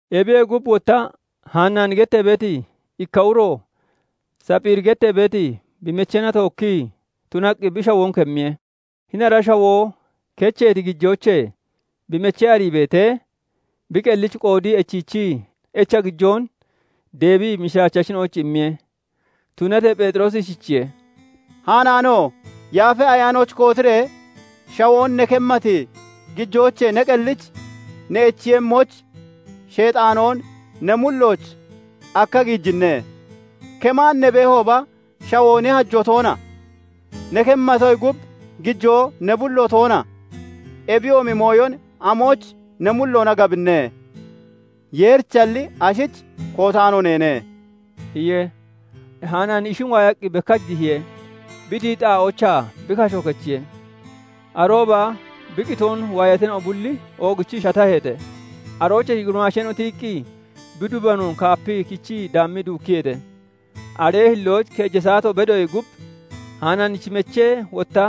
Ebiyee gub, wotta Hanaani gettee beeti ikka uro Sapphiiri gettee beeti bi mecheena tookkii tunaqqi bi shawoon kemmiye. Hini ara shawoo kecheeti gijoochee bi mechee arii beetee, bi qellich qoodii echiichii, echa gijoon deebii mishiraachachina'oyich immiye. Tunatee Pheexiroosi ishichiye:- "Hanaano! Yaafa Ayaanoyich kootiree shawoon ne kemmati gijoochee ne qellich ne echiiyemmoyich Sheexaanoon ne mullooch akkiya giijinne? Kemaan ne beehooba, shawoo ne hajoo toona? Ne kemmatoyee gub, gijoo ne bullo toona? Ebiyoomi mooyon amoyich ne mulloona gabinne? Yeerichalli, ashich kootaano neene" iye. Hanaani ishin waayaqqi bekkach dihiye; bi dihiti xaa'oochaa bi kasho kechiye. Arooba bi qitoon waayatina'o bulli oogichii shataheete. Aroochee gurimaasheena'o tiyiqqi, bi dubanoon kaapiqqi kichii daammii duukkiyeete. Aree hillooch keeja saato bedoyee gub, Hanaanichi mechee wotta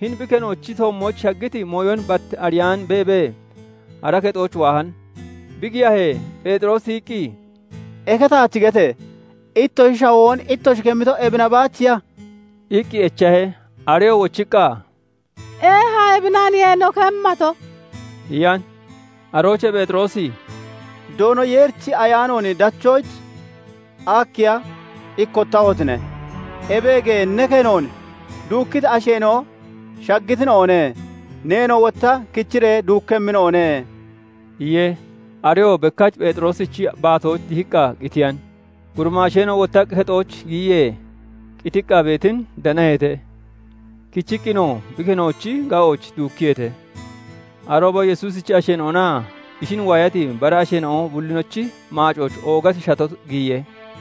hini bi kenoochi toommooch shaggiti mooyon bat ariyaan beebee, ara kexooch waahan. Bi giyahee, Pheexiroosi tiyiqqi, "Eke taach gete! Ittoshi shawoon ittoshi kemmito, ebina baachiya?" iqqi echahe. Areyoo wochiqqa, "Eeha ebinaniye no kemmato" iyan. Aroochee Pheexiroosi "Doono Yeerichi Ayaanoon dachoyich akkiya ikkottahotine? Ebeege! Ne kenoon duukkiti asheena'o shaggitina'one; neenoo wotta kichiree duukkemmina'o ne" iye. Areyoo bekkach Pheexiroosichi baatooch dihiqqa qitiyan. Gurimaasheena'o wottaqqi kexooch giyiyee, qitiqqa beetin danaheete; kichiqqinoo bi kenoochi ga'ooch duukkiyeete. Arooba Yesuusichi asheena'onaa ishin waayati bara asheena'o bullinochi maacooch oogati shato giyiye.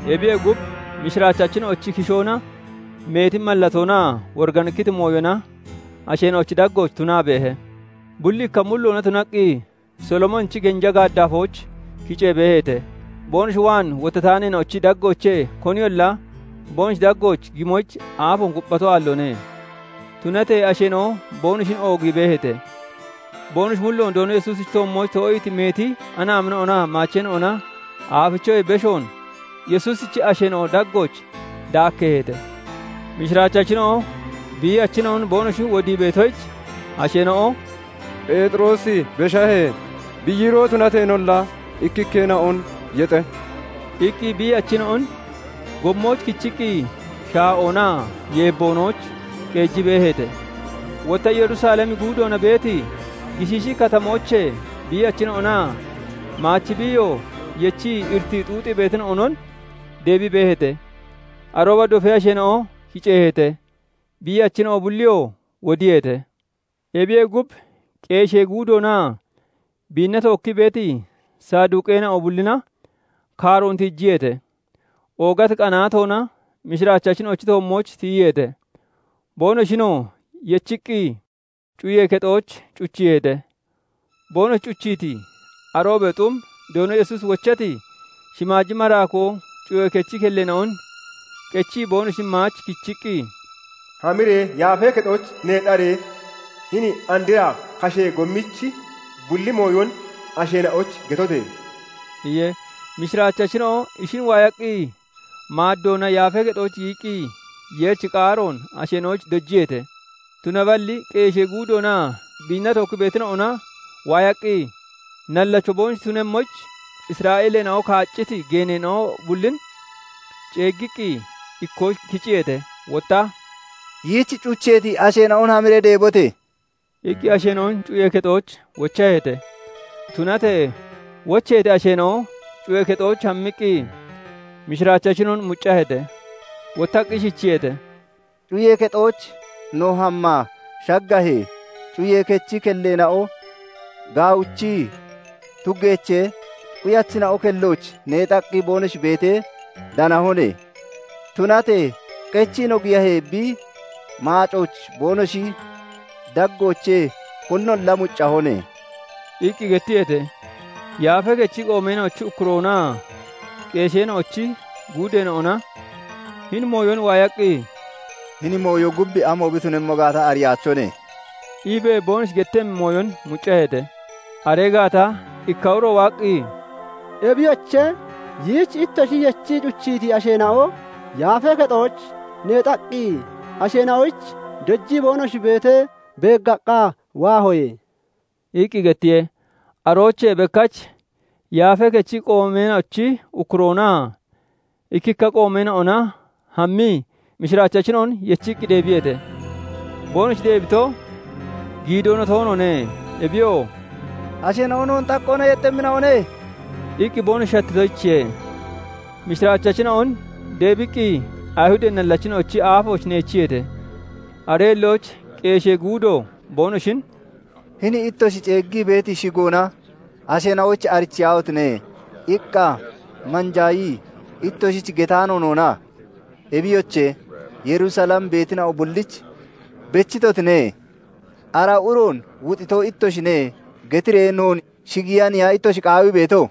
Ebiyee gub, mishiraachachina'ochi kishoona meeti mallatoonaa woriganikkiti mooyona asheena'ochi daggooch tunaa beehe. Bulli ikka mulloona tunaqqi, Solomoonichi genja gaaddafooch kicee beeheete. boonoshi waan wottataaneena'ochi daggoochee koniyolla boonoshi daggooch gimoyich aafoon kupphato aalloone. Tunatee asheena'o boonoshin oogii beeheete. Boonoshi mulloon Doono Yesuusichi toommooch too'iiti meeti anaamina'onaa maacheena'ona aafichoyee beshoon Yesuusichi asheena'o daggooch daakkeeheete. Mishiraachachina'o biiyachina'on boonoshi wodii beetoyich, asheena'o "Pheexiroosi beshahee, bi yiiroo tunateenolla ikkikkeena'on yexe" iqqi biiyachina'on gommooch kichiqqi shaa'oonaa yeebboonooch qeejii beeheete. Wotta Yerusalemi guudoona beeti gishiishi katamoochee biiyachina'onaa maachi biiyo yechii iritii xuuxiitina'onon deebii beeheete. Arooba dofee asheena'o kiceeheete; biiyachina'o bulliyoo wodiyeete. Ebiyee gub, qeeshee guudoonaa biinna tookkii beeti Saduqeena'o bullina kaaroon tiijiyeete; oogati qanaatoona mishiraachachina'ochi toommooch tiyiyeete. Boonoshinoo yechiiqqi, cuyee kexooch cuchiiheete. Boonoshi cuchiiti aroobee xum, Doono Yesuusi wochati shimaaji maraakoo cuyee kechi kelleena'on qechii boonoshin maach kichiqqi, "Hamiree Yaafee Kexooch neexaree, hini andra kashee gommichi bulli mooyon asheena'oyich getote!" iye. Mishiraachachina'o ishin waayaqqi maaddoona Yaafee Kexooch giyiqqi, Yeerichi qaaroon asheena'oyich dojiyeete. Tunaballi qeeshee guudoonaa biinna tookkii beetina'ona waaqqi, nallacho boonoshi tunemmoyich Isra'eeleena'o kaacciti geeneena'o bullin ceeggiqqi, ikkooch kiciyeete; wotta "Yiich cucheeti asheena'on hamiree deebote!" iqqi asheena'on cuyee kexooch wochaheete. Tunatee wocheeti asheena'o cuyee kexooch hammiqqi mishiraachachina'on muccaheete. Wottaqqi ishichiyeete:- "Cuyee kexooch no hammaa shaggahee, cuyee kechi kelleena'o gaawichii tuggeechee, quyachina'o kellooch neexaqqi boonoshi beetee danahone; tunatee qechii no giyahee, bi maacooch boonoshi daggoochee koninolla muccahone" iqqi gettiyeete. Yaafee Kechi qoomeena'ochi ukkuroonaa qeesheena'ochi guudeena'ona hini mooyon waayaqqi, "Hini mooyo gub amo bi tunemmo gaata ariyaachone" iibee boonoshi gettemmi mooyon muccaheete. Aree gaata ikka uro waaqqi, "Ebiyoche, yiich ittoshi yechii cuchiiti asheena'o Yaafee Kexooch neexaqqi, asheena'oyich dojii boonoshi beetee beeggaqqa waahoye" iqqi gettiye. Aroochee bekkach Yaafee Kechi qoomeena'ochi ukkuroonaa ikkikka qoomeena'ona hammii, mishiraachachina'on yechiqqi deebiyeete; boonoshi deebito giidoona toonoone. Ebiyoo "Asheena'o noon xaqqoona yexxemmina'one" iqqi boonoshi shattitoyichiye. Mishraachachina'on deebiqqi, Ayihudee nallachina'ochi aafooch neechiyeete. Aree hillooch qeeshee guudo boonoshin " 'Hini ittoshi ceeggii beeti shigoona asheena'oyich arichiyaahotine!' iqqa manjaayii ittoshich getaano noona? Ebiyoche, Yerusalem beetina'o bullich bechitotine. 'Ara uroon wuxiito ittoshine' getiree noon shigiiyaniya ittoshi qaawii beeto?"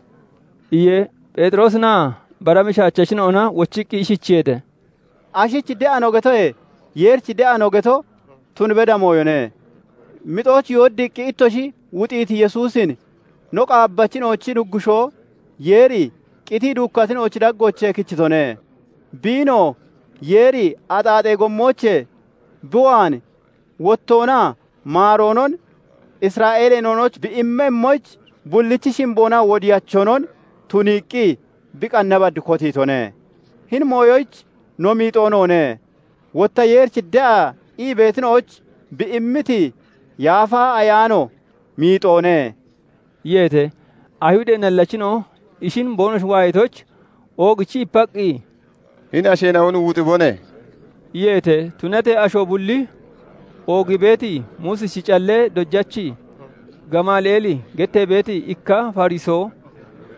iye. Pheexiroosinaa bara mishiraachachina'ona wochiqqi ishichiyeete:- "Ashich de'a no getoyee Yeerich de'a no geto tun beda mooyone. Mixooch yooddiiqqi ittoshi wuxiiti Yesuusin no qaabbachina'ochi Nuggushoo Yeeri qitii duukkatina'ochi daggoochee kichitone. Biinoo Yeeri axaaxee gommoochee bi waan wottoonaa maaroonon Isra'eeleena'oyich bi immemmoyich, bullichi shimboonaa wodiyachonon tuniiqqi bi qanna bad kotiitone. Hini mooyoyich no miixoo noone; wotta Yeerich de'a ii beetina'oyich bi immiti Yaafa Ayaanoo miixoone" iyeete. Ayihudee nallachina'o ishin boonoshi waayatoyich oogichii ipaqqi, "Hini asheena'on wuxibone!" iyeete. Tunatee asho bulli oogii beeti Muusichi callee dojachi Gamali'eeli gettee beeti ikka Fariso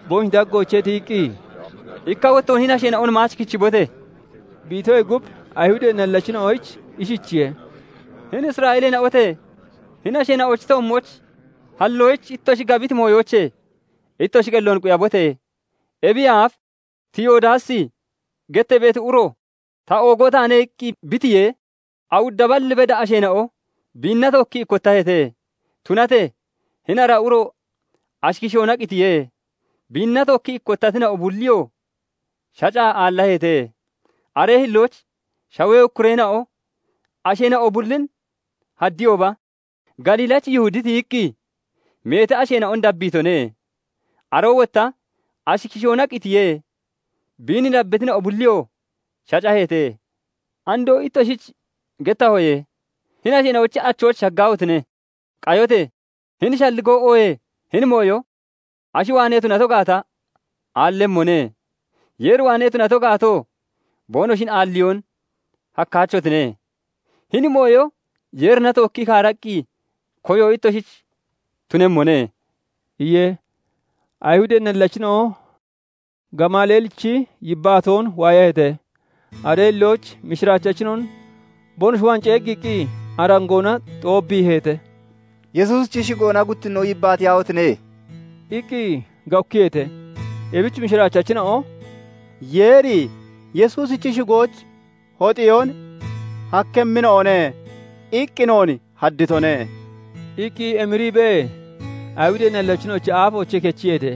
boonoshi daggoochee tiyiqqi, "Ikka wottoon hini asheena'on maach kichibote!" bi itoyee gub, Ayihudee nallachina'oyich ishichiye:- "Hini Isra'eeleena'ote! Hini asheena'ochi toommooch halloyich ittoshi gabiti mooyoochee ittoshi qelloon quyabote! Ebiyee aaf Tiyodaasi gettee beeti uro 'Ta oogoo taane' iqqi bi tiyee, awudda bal beda asheena'o biinna tookkii ikkottaheete. Tunatee hini ara uro ashi kishoona qitiye; biinna tookkii ikkottatina'o bulliyoo shacaa aallaheete. Aree hillooch shawee ukkureena'o asheena'o bullin haddiyooba, Galiilachi Yihudi tiyiqqi meeti asheena'on dabbiitone; aroo wotta ashi kishoona qitiye; biin dabbitina'o bulliyoo shacaheete. Andoo ittoshich gettahoye; hini asheena'ochi achooch shaggaahotine! Qayote! Hini shalligoo oohee hini mooyo ashi waanee tunato gaata aallemmone; Yeer waanee tunato gaatoo, boonoshin aalliyoon hakkaachotine; hini mooyo Yeerina tookkii kaaraqqi koyo ittoshich tunemmone" iye. Ayihudee nallachina'o Gamali'eelichi yibbaatoon waayaheete; aree hillooch mishiraachachina'on boonoshi waan ceeggiiqqi, arangoona xoobbiiheete; "Yesuusichi shigoona guttinnoon yibbaatiyaahotine!" iqqi gawukkiyeete. Ebich mishiraachachina'o "Yeeri 'Yesuusichi shigoyich hoxeyoon hakkemmina'one' iqqi noon hadditone" iqqi emiriibee Ayihudee nallachina'ochi aafoochee kechiyeete.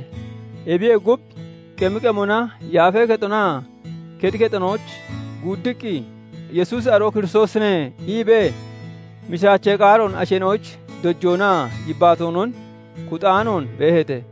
Ebiyee gub, qemi qemona Yaafee Kexonaa kexi kexonooch guuddiqqi, "Yesuusi aroo Kiristoosine" iibee mishiraachee qaaroon asheena'oyich dojoonaa yibbaatoonon kuxaanoon beeheete.